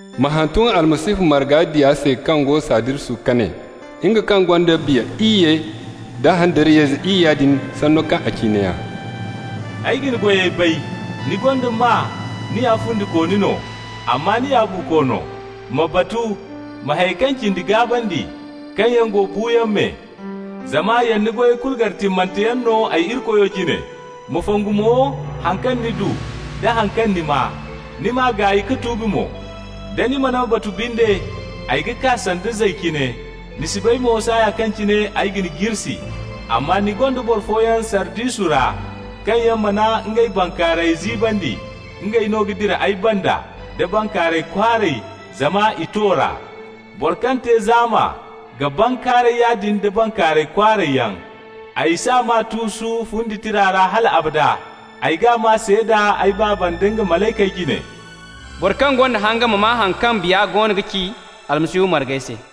Ma hantum Almasihu marga diya se kaŋ go Sardisu ka ne: «Nga kaŋ gonda Irikoy Biya iyye da handariyayze iyya din, sanno kaŋ a ci neeya: Ay ga ni goyey bay. Ni gonda maa ni ya fundikooni no, amma ni ya buuko no. Ma batu! Ma hayey kaŋ cindi gaabandi, kaŋ yaŋ go buuyaŋ me, zama yana ni goyey kulu gar timmante yaŋ no ay Irikoyo jine. Ma fongu mo haŋ kaŋ ni du nda haŋ kaŋ ni maa. Ni m'a gaay ka tuubi mo. Da ni mana batu binde, ay ga kaa sanda zay cine. Ni si bay mo saaya kaŋ cine ay ga ni jirsi. Amma ni gonda boro fooyaŋ Sardisu ra, kaŋ yaŋ mana ngey bankaarayey ziibandi. Ngey no ga dira ay banda da bankaaray kwaaray, zama i to r'a. Boro kaŋ te zaama ga bankaaray yaadin da bankaaray kwaaray yaŋ. Ay s'a maa tuusu fundi tira ra hal abada. Ay g'a maa seeda ay Baaba nda nga malaykey jine. Boro kaŋ gonda hanga ma maa haŋ kaŋ Biya goono ga ci Almasihu margey se.»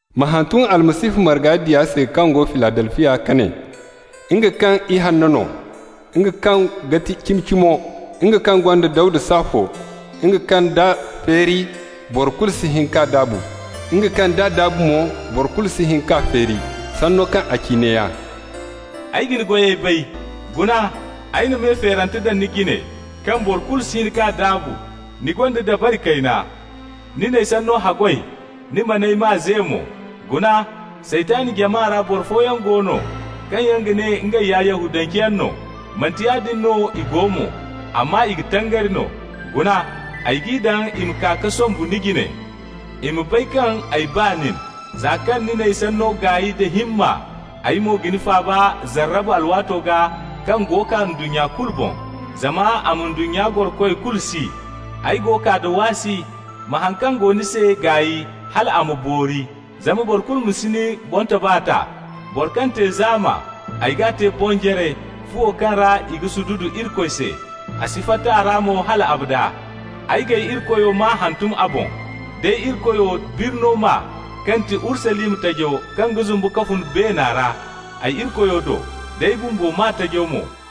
Ma hantum Almasihu marga diya se kaŋ go Filadelfiya ka ne: «Nga kaŋ ya Ihanna no, nga kaŋ ga ti Cimi-Cimo, nga kaŋ gonda Dawda saafo, nga kaŋ d'a feeri, boro kulu si hin ka daabu, nga kaŋ d'a daabu mo, boro kulu si hin ka feeri, sanno kaŋ a ci neeya: Ay ga ni goyey bay. Guna, ay na me feerante daŋ ni jine, kaŋ boro kulu si hin k'a daabu. Ni gonda dabari kayna. Ni n'ay sanno haggoy, ni man'ay maa ze mo. Guna, Saytan jama ra boro fooyaŋ go no, kaŋ yaŋ ga ne ngey ya Yahudanceyaŋ no, manti yaadin no i go mo, amma i ga tangari no. Guna, ay g'i daŋ i ma kaa ka sombu ni jine, i ma bay kaŋ ay ba nin. Za kaŋ ni n'ay sanno gaay da himma, ay mo ga ni faaba zarraba alwaato gaa kaŋ go kaa ndunnya kulu boŋ, zama a ma ndunnya gorokoy kulu si. Ay go kaa da waasi. Ma haŋ kaŋ go ni se gaay hal a ma boori, zama boro kulu ma si ni boŋtoba ta. Boro kaŋ te zaama, ay g'a te bonjare, fuwo kaŋ ra i ga sududu Irikoy se. A si fatta a ra mo hal abada. Ay g'ay Irikoyo maa hantum a boŋ, d'ay Irikoyo birno maa, kaŋ ti Urusalima tajo kaŋ ga zumbu ka fun beena ra ay Irikoyo do, d'ay bumbo maa tajo mo.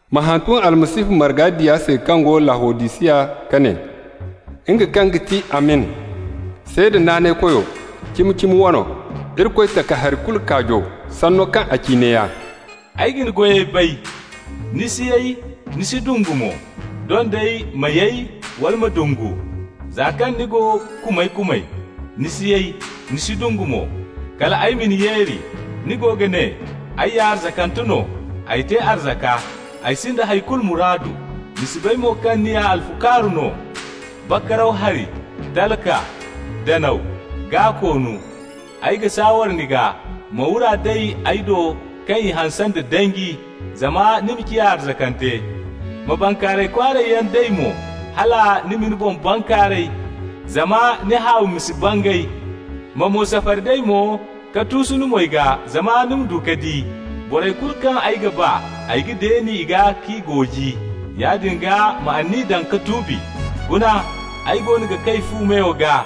Ma hantum Almasihu marga diya se kaŋ go Lawodisiya ka ne: «Nga kaŋ ga ti Amin, Seeda naanaykoyo, cimi-cimo wano, Irikoy takahari kulu Kaajo, sanno kaŋ a ci neeya: Ay ga ni goyey bay. Ni si yay, ni si dungu mo. Doŋ day ni ma yay wala ni ma dungu! Za kaŋ ni go kumay-kumay, ni si yay, ni si dungu mo, kal ay ma ni yeeri. Ni go ga ne: ay ya arzakante no, ay te arzaka, ay sinda hay kulu muraadu! Ni si bay mo kaŋ ni ya alfukaaru no, bakaraw hari, talka, danaw, gaa-koonu! Ay ga saaware ni gaa, ma wura day ay do kaŋ i hanse danji ra, zama ni ma ciya arzakante. Ma bankaaray kwaaray yaŋ day mo, hal ni ma ni boŋ bankaaray, zama ni haawi ma si bangay. Ma mo safari day mo ka tuusu ni moy gaa zama ni ma du ka di. Borey kulu kaŋ ay ga ba, ay ga deeni i gaa k'i gooji. Yaadin gaa, ma anniya daŋ ka tuubi. Guna, ay goono ga kay fu meyo gaa,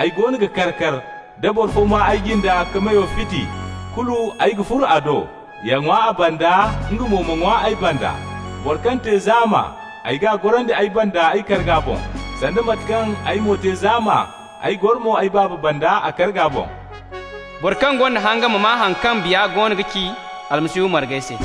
ay goono ga kar-kar. Da boro fo maa ay jinda ka meyo fiti, kulu ay ga furo a do, ya ŋwa a banda, nga mo ma ŋwa ay banda. Boro kaŋ te zaama, ay g'a gorandi ay banda ay karga boŋ, sanda mate kaŋ ay mo te zaama, ay goro mo ay Baaba banda a karga boŋ. Boro kaŋ gonda hanga ma maa haŋ kaŋ Biya goono ga ci Almasihu margey se.»